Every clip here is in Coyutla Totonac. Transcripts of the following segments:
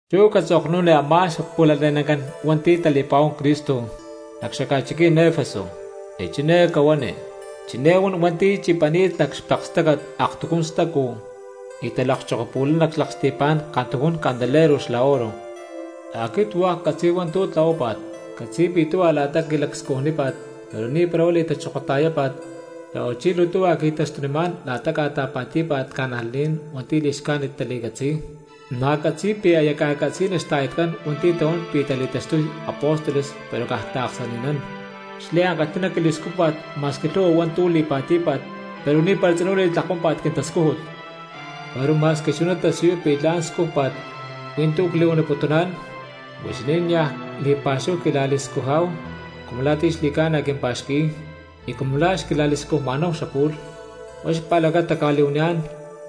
’Chú catzoknuni a̠má xpu̠lale̠nacán hua̠nti̠ tali̠pa̠huán Cristo nac xaca̠chiquí̠n Efeso, y chiné cahuani: “Chiné huan hua̠nti̠ chipani̠t nac xpekestácat aktujún stacu y talakchokopu̠lay nac xlaksti̠pá̠n kantujún candelero xla oro: Aquit hua̠k ccatzi̠y hua̠ntu̠ tlahuápa̠t; ccatzi̠y pi̠ tuhua la̠ta quilacscujnípa̠t, pero ni̠para huá li̠tachokota̠yápa̠t; xa̠huachí luu tuhua qui̠taxtunimá̠n la̠ta ca̠ta̠pa̠tí̠pa̠t cristianos hua̠nti̠ li̠xcájnit tali̠catzi̠y. Na̠ ccatzi̠y pi̠ aya ca̠catzi̠ni xta̠yatcán hua̠nti̠ tahuán pi̠ tali̠taxtuy apóstoles pero caj taaksani̠nán. Xliankalhi̠ná quili̠scújpa̠t ma̠squi lhu̠hua hua̠ntu̠ li̠pa̠tí̠pa̠t pero ni̠para tzinú li̠tlakuámpa̠t quintascújut. Pero ma̠squi chuná tasiyuy pi̠ la̠n scújpa̠t, hui̠ntú cli̠huaniputuná̠n, huixinín niaj li̠pa̠xúhu quila̠li̠scujá̠hu cumu la̠ ti̠ xli̠ca̠na quimpa̠xqui̠y y cumu la̠ xquila̠li̠scujma̠náhu xapu̠lh. Huá xpa̠lacata cca̠li̠huaniyá̠n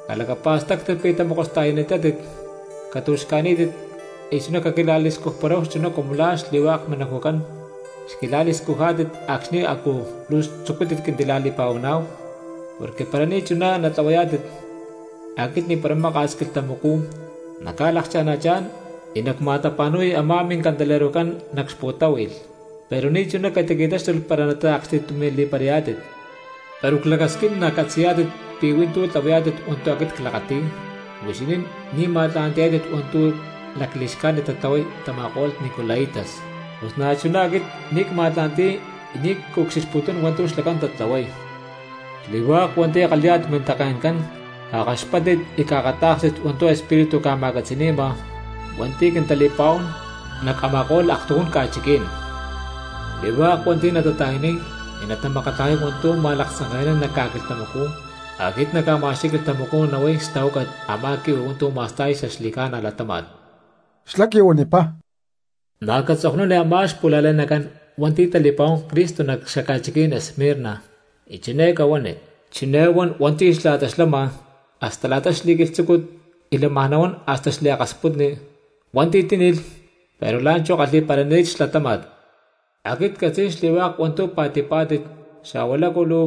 calacapa̠stáctit pi̠ tamokosta̠yani̠tátit, catu̠xca̠ní̠tit y chuná caquila̠li̠scujparáhu chuná cumu la̠ xli̠hua̠k minacujcán xquila̠li̠scujá̠tit acxni̠ a̠cú luu tzucútit quintila̠li̠pa̠huaná̠hu, porque para ni̠chuná natlahuayá̠tit aquit ni̠para maka̠s quilhtamacú nacca̠lakana̠chá̠n y nacma̠tapa̠nu̠y a̠má mincandelerocán nac xpu̠táhui̠lh, pero ni̠chuná catiqui̠táxtulh para taaksti̠tumi̠li̠parayá̠tit. Pero clacasquín nacatzi̠yá̠tit pi̠ hui̠ntú tlahuayá̠tit hua̠ntu̠ aquit clakati̠y, huixinín ni̠ ma̠tla̠ntiyá̠tit hua̠ntu̠ lacli̠xcájnit tatlahuay tama̠ko̠lh nicolaitas, pus na̠chuná aquit ni̠ cma̠tla̠nti̠y y ni̠ cucxilhputún hua̠ntu̠ xlacán tatlahuay.” ’¡Xli̠hua̠k hua̠nti̠ kalhi̠yá̠tit mintake̠ncán cakaxpáttit y caakatá̠kstit hua̠ntu̠ Espíritu ca̠ma̠catzi̠ni̠ma hua̠nti̠ quintali̠pa̠huán nac a̠ma̠ko̠lh aktujún ca̠chiquí̠n! Xli̠hua̠k hua̠nti̠ natata̠yaniy y natamakatlajay hua̠ntu̠ ma̠laktzanke̠nán nac ca̠quilhtamacú aquit nacma̠xqui̠y quilhtamacú nahuay xtahuácat a̠má quihui hua̠ntu̠ ma̠sta̠y xaxli̠ca̠na latáma̠t. Xlá quihuanipá: —Na̠ catzoknuni a̠má xpu̠lale̠nacán hua̠nti̠ tali̠pa̠huán Cristo nac xaca̠chiquí̠n Esmirna, y chiné cahuani: “Chiné huan hua̠nti̠ xla̠ta xlama hasta la̠ta xli̠quilhtzúcut y lámaj nahuán hasta xliakasputni, hua̠nti̠ tíni̠lh pero la̠nchú kalhi̠parani̠t xlatáma̠t: Aquit ccatzi̠y xli̠hua̠k hua̠ntu̠ pa̠tí̠pá̠tit xa̠hua lácu luu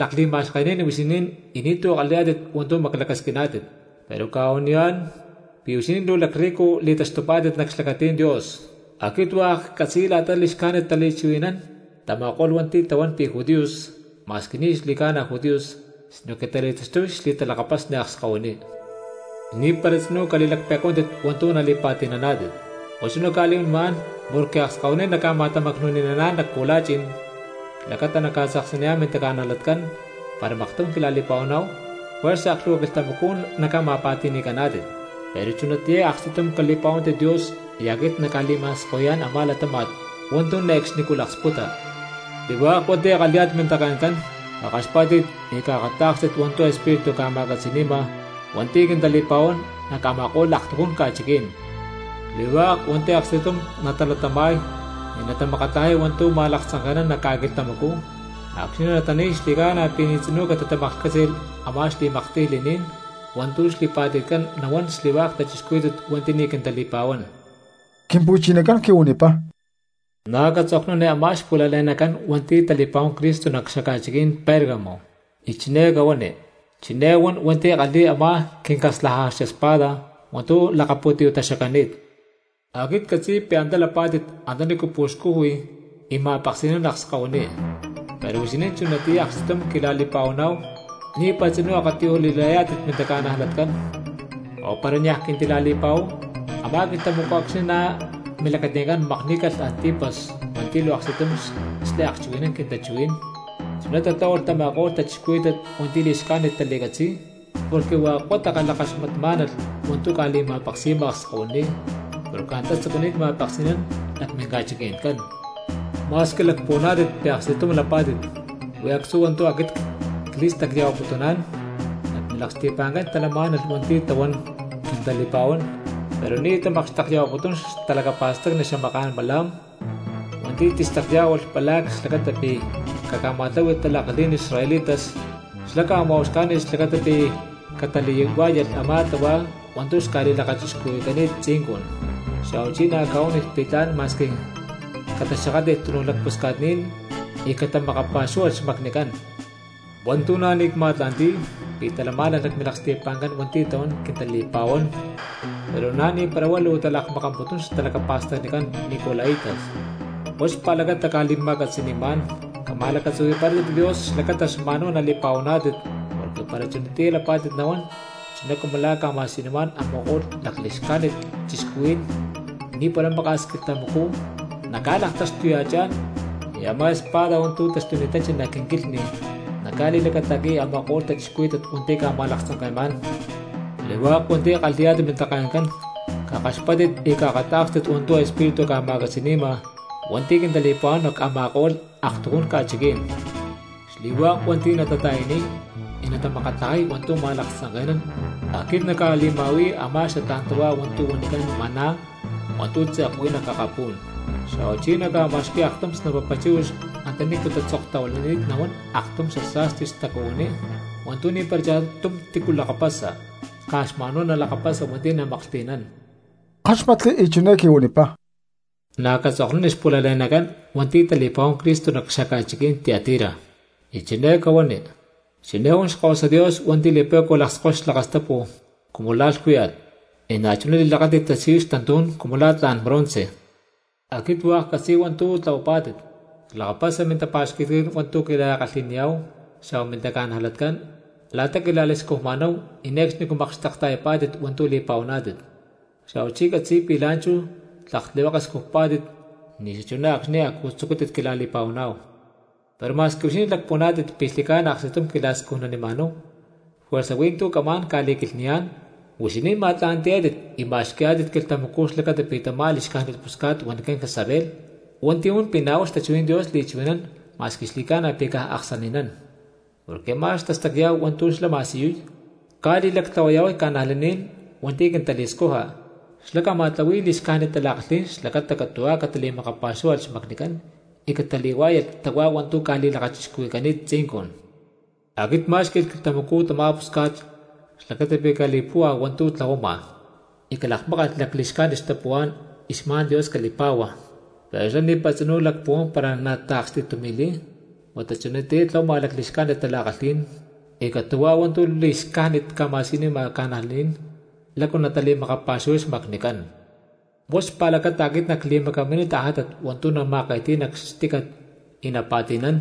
lakli̠ma̠xkení̠n huixinín y ni̠tu̠ kalhi̠yá̠tit hua̠ntu̠ maclacasquiná̠tit, pero cca̠huaniyá̠n pi̠ huixinín luu lacrrico li̠taxtupá̠tit nac xlacatí̠n Dios. Aquit hua̠k ccatzi̠y la̠ta li̠xcájnit tali̠kalhchuhui̠naná̠n tama̠ko̠lh hua̠nti̠ tahuán pi̠ judíos, ma̠squi ni̠ xli̠ca̠na judíos sinoque tali̠taxtuy xli̠talakapasni akskahuiní. Ni̠para tzinú cali̠laklhpe̠cuántit hua̠ntu̠ nali̠pa̠ti̠naná̠tit, huá chuná cca̠li̠huanimá̠n porque akskahuiní naca̠ma̠tamacnu̠ni̠naná̠n nac pu̠la̠chi̠n xlacata naca̠tzaksaniyá̠n mintaca̠najlatcán para maktum quila̠li̠pa̠huaná̠hu; juerza aklhu̠hua quilhtamacú naca̠ma̠pa̠ti̠ni̠caná̠tit, pero chunatiyá aksti̠tum cali̠pa̠huántit Dios y aquit nacca̠li̠ma̠skahui̠yá̠n a̠má latáma̠t hua̠ntu̠ ne̠cxnicú laksputa.” ’¡Xli̠hua̠k hua̠nti̠ kalhi̠yá̠tit mintake̠ncán cakaxpátit y caakatá̠kstit hua̠ntu̠ Espíritu ca̠ma̠catzi̠ni̠ma hua̠nti̠ quintali̠pa̠huán nac a̠ma̠ko̠lh aktujún ca̠chiquí̠n! Xli̠hua̠k hua̠nti̠ aksti̠tum natalatama̠y y natamakatlajay hua̠ntu̠ ma̠laktzanke̠nán nac ca̠quilhtamacú, acxni̠ natani̠y xli̠ca̠na pi̠ ni̠ tzinú catitamaklhcátzi̠lh a̠má xli̠maktiy li̠ní̠n hua̠ntu̠ xli̠pa̠ti̠tcán nahuán xli̠hua̠k cristianos hua̠nti̠ ni̠ quintali̠pa̠huán. Quimpu̠chinacán quihuanipá: —Na̠ catzoknuni a̠má xpu̠lale̠nacán hua̠nti̠ tali̠pa̠huán Cristo nac xaca̠chiquí̠n Pérgamo, y chiné cahuani: “Chiné huan hua̠nti̠ kalhi̠y a̠má quincaslajaja espada hua̠ntu̠ lakapu̠tiyú̠ taxacani̠t: Aquit ccatzi̠y pi̠ antá lapá̠tit antanícu puxcuhui y ma̠peksi̠nán akskahuiní; pero huixinín chunatiyá aksti̠tum quila̠li̠pa̠huaná̠hu, ni̠para tzinú akatiyuj li̠látit mintaca̠najlatcán o para niaj quintila̠li̠pa̠huáhu a̠má quilhtamacú acxni̠ nac milacati̠ncán makní̠calh Antipas hua̠nti̠ luu aksti̠tum xliakchuhui̠nán quintachuhuí̠n; chuná tatláhualh tama̠ko̠lh cristianos hua̠nti̠ li̠xcájnit tali̠catzi̠y porque hua̠k huá takalhakaxmatmá̠nalh hua̠ntu̠ ca̠li̠ma̠peksi̠ma akskahuiní, porque antá tzucuni̠t ma̠peksi̠nán nac minca̠chiqui̠ncán. Ma̠squi lacpuhuaná̠tit pi̠ aksti̠tum lapá̠tit, huí actzú hua̠ntu̠ aquit cli̠stacya̠huaputuná̠n: nac milaksti̠pa̠ncán talamá̠nalh hua̠nti̠ tahuán quintali̠pa̠huán pero ni̠ tamakxtekya̠huaputún xtalacapa̠stacni xamaká̠n Balaam, hua̠nti̠ tistacyá̠hualh Balac xlacata pi̠ caca̠ma̠tláhui̠lh tala̠kalhí̠n israelitas, xlá ca̠ma̠uxcá̠ni̠lh xlacata pi̠ catali̠huá̠yalh a̠má tahuá hua̠ntu̠ xca̠li̠lakachixcuhui̠cani̠t tzincun, xa̠huachí na̠ ca̠huánilh pi̠ tla̠n ma̠squi cataxakátli̠lh túnuj lacpusca̠tní̠n y catamakapa̠xúhualh xmacnicán. Hua̠ntu̠ na̠ ni̠ cma̠tla̠nti̠y pi̠ talamá̠nalh nac milaksti̠pa̠ncán hua̠nti̠ tahuán quintali̠pa̠huán pero na̠ ni̠para huá luu talakmakamputún xtalacapa̠stacnicán nicolaitas. Huá xpa̠lacata cca̠li̠ma̠catzi̠ni̠má̠n, cama̠lacatzuhui̠parátit Dios xlacata xma̠n huá nali̠pa̠huaná̠tit, porque para chunatiyá lapá̠tit nahuán chuná cumu la̠ ca̠ma̠siyunimá̠n a̠ma̠ko̠lh lacli̠xcájnit cristianos ni̠para maka̠s quilhtamacú nacca̠laktaxtuya̠chá̠n y a̠má espada hua̠ntu̠ taxtuni̠tanchi nac quinquilhni nacca̠li̠lacata̠qui̠y a̠ma̠ko̠lh cristianos hua̠nti̠ ca̠ma̠laktzanke̠má̠n.” ’¡Xli̠hua̠k hua̠nti̠ kalhi̠yá̠tit mintake̠ncán cakaxpáttit y caakatá̠kstit hua̠ntu̠ Espíritu ca̠ma̠catzi̠ni̠ma hua̠nti̠ quintali̠pa̠huán nac a̠ma̠ko̠lh aktujún ca̠chiquí̠n! Xli̠hua̠k hua̠nti̠ natata̠yaniy y natamakatlajay hua̠ntu̠ ma̠laktza̠nke̠nán, aquit nacca̠li̠ma̠hui̠y a̠má xatlá̠n tahuá hua̠ntu̠ huanicán maná hua̠ntu̠ tze̠k huí nac akapú̠n. Xa̠huachí nacca̠ma̠xqui̠y aktum snapapa chíhuix antanícu tatzoktahuilani̠t nahuán aktum xasa̠sti tacuhuiní hua̠ntu̠ ni̠para cha̠tum tícu lakapasa caj xma̠n huá nalakapasa hua̠nti̠ namaklhti̠nán. Ckáxmatli y chiné quihuanipá: —Na̠ catzoknuni xpu̠lale̠nacán hua̠nti̠ tali̠pa̠huán Cristo nac xaca̠chiquí̠n Tiatira, y chiné cahuani: “Chiné huan Xkahuasa Dios hua̠nti̠ li̠pe̠cua lakskoy xlakastapu cumu la̠ lhcúya̠t, y na̠chuná li̠lakáti̠t tasiyuy xtantú̠n cumu la̠ tla̠n bronce: Aquit hua̠k ccatzi̠y hua̠ntu̠ tlahuapá̠tit; clakapasa mintapa̠xqui̠tcán hua̠ntu̠ quila̠kalhi̠niyá̠hu xa̠hua mintaca̠najlatcán, la̠ta quila̠li̠scujmá̠hu y ne̠cxnicú makxtekta̠yapá̠tit hua̠ntu̠ li̠pa̠huaná̠tit, xa̠huachí ccatzi̠y pi̠ la̠nchú tlak tlihueke scujpá̠tit ni̠ xachuná acxni̠ a̠cú tzucútit quila̠li̠pa̠huaná̠hu. Pero ma̠squi huixinín lacpuhuaná̠tit pi̠ xli̠ca̠na aksti̠tum quila̠li̠scujmá̠hu juerza huí hua̠ntu̠ camá̠n ca̠li̠quilhni̠yá̠n: huixinín ma̠tla̠nti̠yá̠tit y ma̠xqui̠yá̠tit quilhtamacú xlacata pi̠ tamá li̠xcájnit pusca̠t huanicán Jezabel, hua̠nti̠ huan pi̠ na̠ huá xtachuhuí̠n Dios li̠chuhui̠nán ma̠squi xli̠ca̠na pi̠ caj aksani̠nán, porque a̠má xtastacyá̠hu hua̠ntu̠ xlá ma̠siyuy, ca̠li̠lactlahuaya̠huay cristianos hua̠nti̠ quintali̠scuja, xlá ca̠ma̠tlahui̠y li̠xcájnit tala̠kalhí̠n xlacata catu̠huá catali̠makapa̠xúhualh xmacnicán y catali̠huá̠yalh tahuá hua̠ntu̠ ca̠li̠lakachixcuhui̠cani̠t tzincun. Aquit cmá̠xqui̠lh quilhtamacú tamá pusca̠t xlacata pi̠ cali̠li̠púhua hua̠ntu̠ tlahuama, y calakmákalh xali̠xcájnit xtapuhuá̠n y xma̠n Dios cali̠pa̠hua, pero xlá ni̠para tzinú lacpuhuán para nataaksti̠tumi̠li̠y huata chunatiyá tlahuama li̠xcájnit tala̠kalhí̠n y catu̠huá hua̠ntu̠ li̠xcájnit ca̠ma̠siyunima cristianos lácu natali̠makapa̠xuhuay xmacnicán. Huá xpa̠lacata aquit nacli̠macaminiy tajátat hua̠ntu̠ nama̠ke̠ti̠y nac xtícat y napa̠ti̠nán;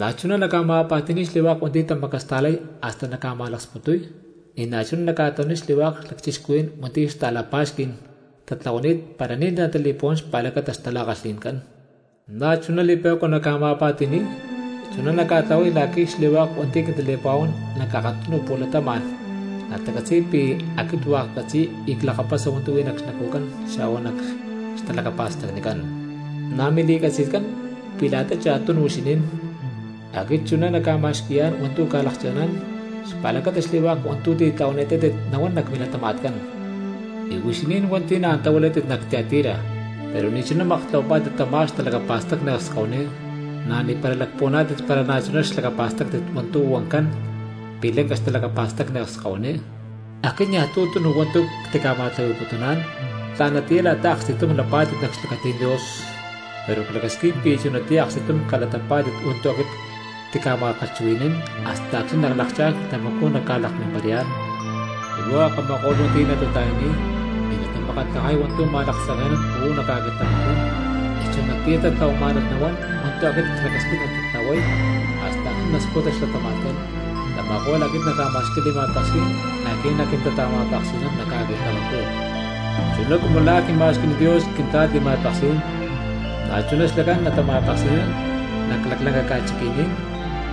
na̠chuná nacca̠ma̠pa̠ti̠ni̠y xli̠hua̠k hua̠nti̠ tamacasta̠lay hasta nacca̠ma̠laksputuy; y na̠chuná nacca̠tlahuaniy xli̠hua̠k lacchixcuhuí̠n hua̠nti̠ xta̠la̠pa̠xquí̠n tatlahuani̠t para ni̠ tali̠puhuán xpa̠lacata xtala̠kalhi̠ncán, na̠chuná li̠pe̠cua nacca̠ma̠pa̠ti̠ni̠y. Chuná nactlahuay la̠qui̠ xli̠hua̠k hua̠nti̠ quintali̠pa̠huán nac akatunu pu̠latama̠n natacatzi̠y pi̠ aquit hua̠k ccatzi̠y y clakapasa hua̠ntu̠ huí nac xnacujcán xa̠hua nac xtalacapa̠stacnicán. Na̠ mili̠catzi̠tcán pi̠ la̠ta cha̠tunu huixinín aquit chuná nacca̠ma̠xqui̠yá̠n hua̠ntu̠ ca̠lakcha̠ná̠n xpa̠lacata xli̠hua̠k hua̠ntu̠ titlahuani̠tátit nahuán nac milatama̠tcán. Y huixinín hua̠nti̠ na̠ antá huilátit nac Tiatira pero ni̠chuná maktlahuapá̠tit tamá xtalacapa̠stacni akskahuiní, na̠ ni̠para lacpuhuaná̠tit para pi̠ na̠chuná xlakapástit hua̠ntu̠ huancán pi̠ lanca xtalacapa̠stacni akskahuiní, aquit niaj tu̠ tunu hua̠ntu̠ ctica̠ma̠tlahui̠putuná̠n tla̠natiyá la̠ta aksti̠tum lapá̠tit nac xlacatí̠n Dios. Pero clacasquín pi̠ chunatiyá aksti̠tum cali̠latapá̠tit hua̠ntu̠ aquit ctica̠ma̠kalhchuhui̠ní̠n hasta acxni̠ nalakchá̠n quilhtamacú nacca̠lakmimparayá̠n. Xli̠hua̠k a̠ma̠ko̠lh hua̠nti̠ natata̠yaniy y natamakatlajay hua̠ntu̠ ma̠laktzanke̠nán uú nac ca̠quilhtamacú, y chunatiyá tatlahuamá̠nalh nahuán hua̠ntu̠ aquit clacasquín natatlahuay hasta acxni̠ nasputa xlatama̠tcán, tama̠ko̠lh aquit nacca̠ma̠xqui̠y li̠ma̠peksí̠n la̠qui̠ naquintata̠ma̠peksi̠nán nac ca̠quilhtamacú. Chuná cumu la̠ quima̠xqui̠ni̠t Dios quintla̠t li̠ma̠peksí̠n, na̠chuná xlacán natama̠peksi̠nán nac laclanca ca̠chiqui̠ní̠n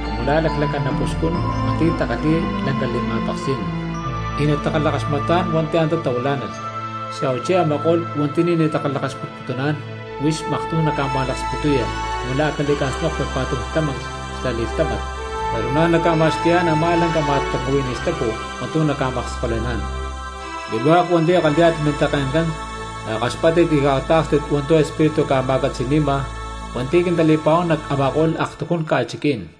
cumu la̠ laclanca napuxcún hua̠nti̠ takalhi̠y lanca li̠ma̠peksí̠n, y natakalhakaxmatá̠n hua̠nti̠ antá tahuilá̠nalh, xa̠huachí a̠ma̠ko̠lh hua̠nti̠ ni̠ natakalhakaxmatputuná̠n huixín maktum naca̠ma̠laksputuya cumu la̠ a̠ cali̠ca̠snokpi pa̠tum tlámanclh xla li̠lhtámat. Pero na̠ nacca̠ma̠xqui̠yá̠n a̠má lanca ma̠tuncuhuiní stacu hua̠ntu̠ naca̠makskole̠ná̠n.” ’¡Xli̠hua̠k hua̠nti̠ kalhi̠yá̠tit mintake̠ncán cakaxpáttit y caakatá̠kstit hua̠ntu̠ Espíritu ca̠ma̠catzi̠ni̠ma hua̠nti̠ quintali̠pa̠huán nac a̠ma̠ko̠lh aktujún ca̠chiquí̠n!